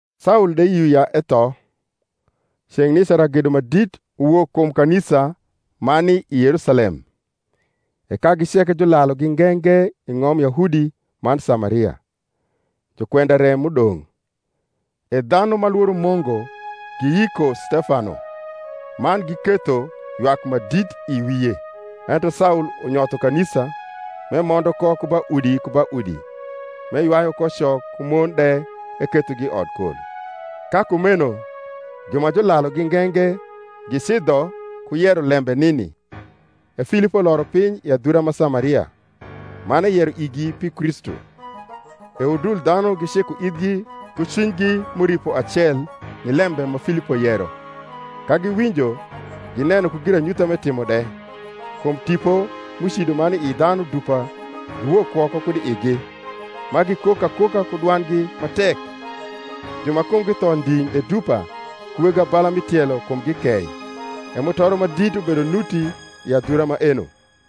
Saul de yio ya etho. Ceng’ nica ragedo ma dit uwok kum kanisa ma ni i Yerusalem; e kagi ceke julalugi nge nge i ng’om Yahudi man Samaria, jukwenda re m’udong’. E dhanu ma lworo Mungu giyiko Stefano, man giketho ywak ma dit i wie. Ento Saul unyotho kanisa, m’emondo ko ku ba udi ku ba udi, m’eywayu ko co ku mon de ekethogi i odkol. Ka kumeno ju ma julalugi nge nge gicidho ku yero lembe nini. E Filipo loro piny i adhura ma Samaria, man eyero igi pi Kristu. E udul dhanu giciko ithgi ku cwinygi m’uripo acel ni lembe ma Filipo yero, ka giwinjo, gineno ku giranyutha m’etimo de. Kum tipo m’ucido ma ni ii dhanu dupa, giwok woko kud i igi, ma gikok akoka ku dwandgi ma tek: ju ma kumgi tho nding’ de dupa, ku weg abala mi tielo, kumgi kei. E mutoro ma dit ubedo nuti i adhura maeno.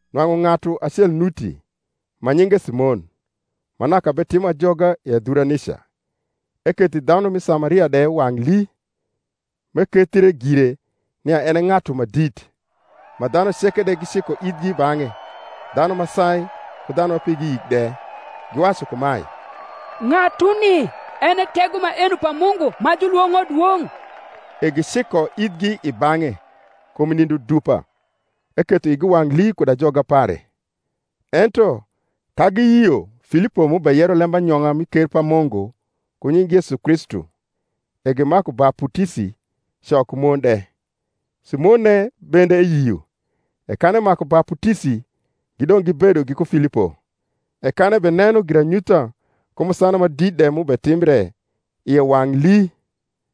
Nwang’u ng’atu acel nuti, ma nyinge Simon, ma naka betimo ajoga i adhura nica, eketho i dhanu ma Samaria de wang’ lii, m’ekethie gire nia en e ng’atu ma dit: ma dhanu ceke de giciko ithgi i bang’e, dhanu ma sai ku dhanu ma pigi yik de, giwacu kumae, Ng’atuni en e tego maeno pa Mungu ma julwong’o Dwong’. E giciko ithgi i bang’e, kum nindo dupa eketho igi wang’ lii kud ajoga pare. Ento ka giyio Filipo m’ubeyero lembanyong’a mi ker pa Mungu ku nying’ Yesu Kristu, e gimaku baputisi, co ku mon de. Simonne bende eyio: e kan emaku baputisi, gidong’ gibedo giku Filipo; e kan ebeneno giranyutha ku musana ma dit de m’utimbre, ie wang’ lii.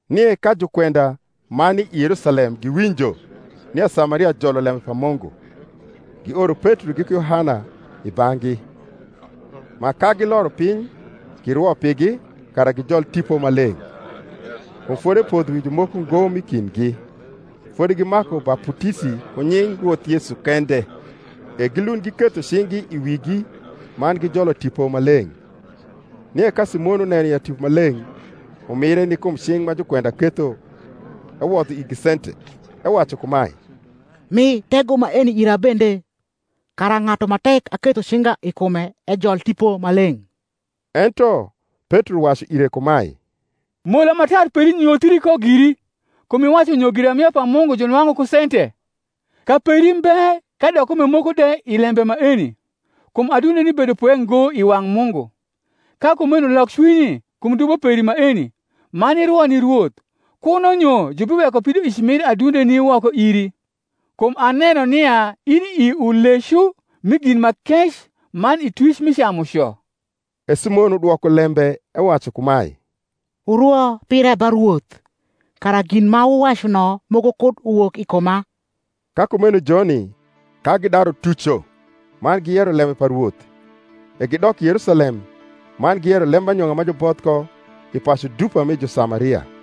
Nie ka jukwenda ma ni i Yerusalem giwinjo nia Samaria jolo lembe pa Mungu, gioro Petro giku Yohana i bang’gi: ma, ka giloro piny, girwo pigi, kara gijol Tipo Maleng’: kum fodi epodho wi jumoko ngo m’i kindgi: fodi gimaku baputisi ku nying Rwoth Yesu kende. E gilund giketho cing’gi i wigi, man gijolo Tipo Maleng’. Nie ka Simon uneno ya Tipo Maleng’ umire ni kum cing’ ma jukwenda ketho, ewodho igi sente, ewacu kumae, Mi tego maeni ira bende, kara ng’atu ma tek aketho cinga i kume ejol Tipo Maleng’. Ento Petro wacu ire kumae, Mola ma tar peri nyothii ko giri, kum iwacu nyo giramia pa Mungu junwang’u ku sente. Kaperi mbe kadok kume moko de i lembe maeni: kum adundeni bedo pwe ngo i wang’ Mungu. Ka kumeno lok cwinyi kum dubo peri maeni, man irwo ni Rwoth, kuno nyo jubiweko pidoic mir adundeni woko iri. Kum aneno nia ini i ulecu mi gin ma kec man i twic mi camuco. E Simon udwoko lembe ewacu kumae, Wurwo pira ba Rwoth, kara gin ma wuwacu no moko kud uwok i kuma. Ka kumeno joni, ka gidaru tuco man giyero lembe pa Rwoth, e gidok i Yerusalem, man giyero lembanyong’a ma juboth ko i pacu dupa mi Jusamaria.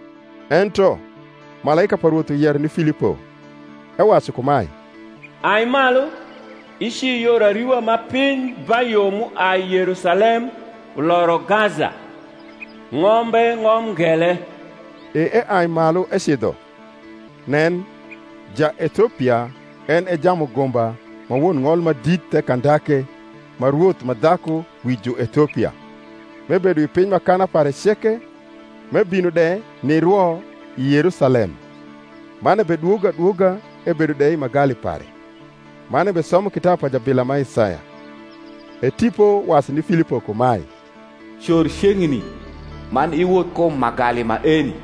Ento malaika pa Rwoth uyero ni Filipo, ewacu kumae, Ai malu, ici yor ariwa ma piny ba yo m’uai Yerusalem uloro Gaza: ng’ombe ng’om ngele. E eai malu ecidho: nen, Jaethiopia, en e jamugumba ma won ng’ol ma dit the Kandake ma rwoth ma dhaku wi Juethiopia, m’ebedo wi piny m’akana pare ceke, m’ebino de nirwo i Yerusalem; man ebedwogo adwoga ebedo de i magali pare, man ebesomo kitabu pa jabila ma Isaya. E Tipo wacu ni Filipo kumae, Cor ceng’ni, man iwoth kum magali maeni.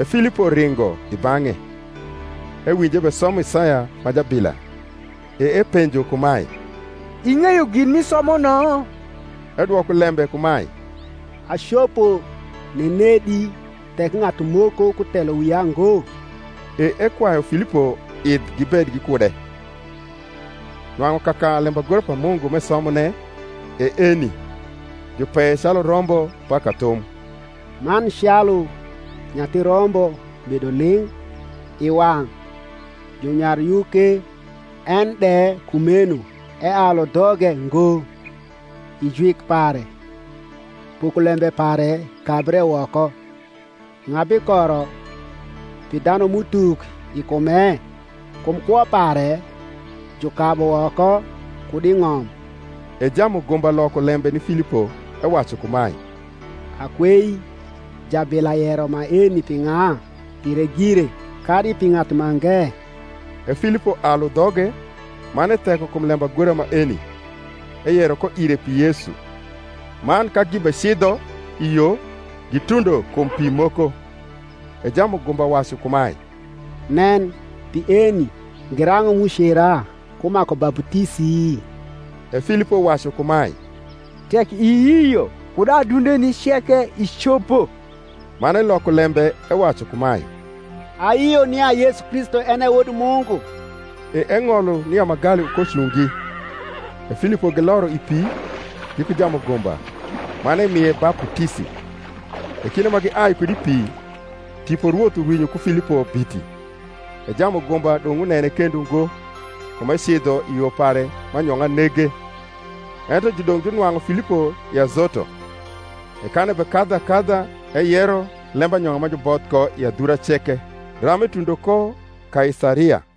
E Filipo ringo i bang’e, ewinjo ebesomo Isaya ma jabila, e epenjo kumae, Ing’eyo gin m’isomo no? Edwoko lembe kumae, Acopo nenedi, tek ng’atu moko kutelo wia ngo? E ekwayu Filipo idh gibed gikude. Nwang’u kaka lembagora pa Mungu m’esomone e eni, Jupeye calu rombo ba kathum; Man calu nyathi rombo bedo ling’ i wang’ junyaryuke, En de kumeno ealu dhoge ngo: I jwik pare pokolembe pare kabre woko: Ng’a bikoro pi dhanum’utuk i kume? Kum kwo pare jukabu woko kud i ng’om. E jamugumba loko lembe ni Filipo ewacu kumae, Akwei, jabila yero maeni pi ng’a? pire gire, kadi pi ng’atu mange? E Filipo alu dhoge, man etheko kum lembagora maeni, eyero ko ire pi Yesu. Man ka gibecidho i yo, gitundo kum pi moko; e jamugumba wacu kumae, Nen, pi eni; girang’o m’ucera ku maku baputisi? E Filipo wacu kumae, Tek iyio kud adundeni ceke icopo. Man eloko lembe ewacu kumae, Ayio nia Yesu Kristu en e Wod Mungu. E eng’olo nia magali ukoucungi: e Filipo giloro i pi, giku jamugumba; man emie baputisi. E kinde ma giai kud i pi, Tipo Rwoth urwinyo ku Filipo biti; e jamugumba dong’ unene kendo ngo, kum ecidho i yo pare ma anyong’a nege. Ento judong’ junwang’u Filipo i Azoto: e kan ebekadhu akadha eyero lembanyong’a ma juboth ko i adhura ceke ram etundo ko Kaisaria.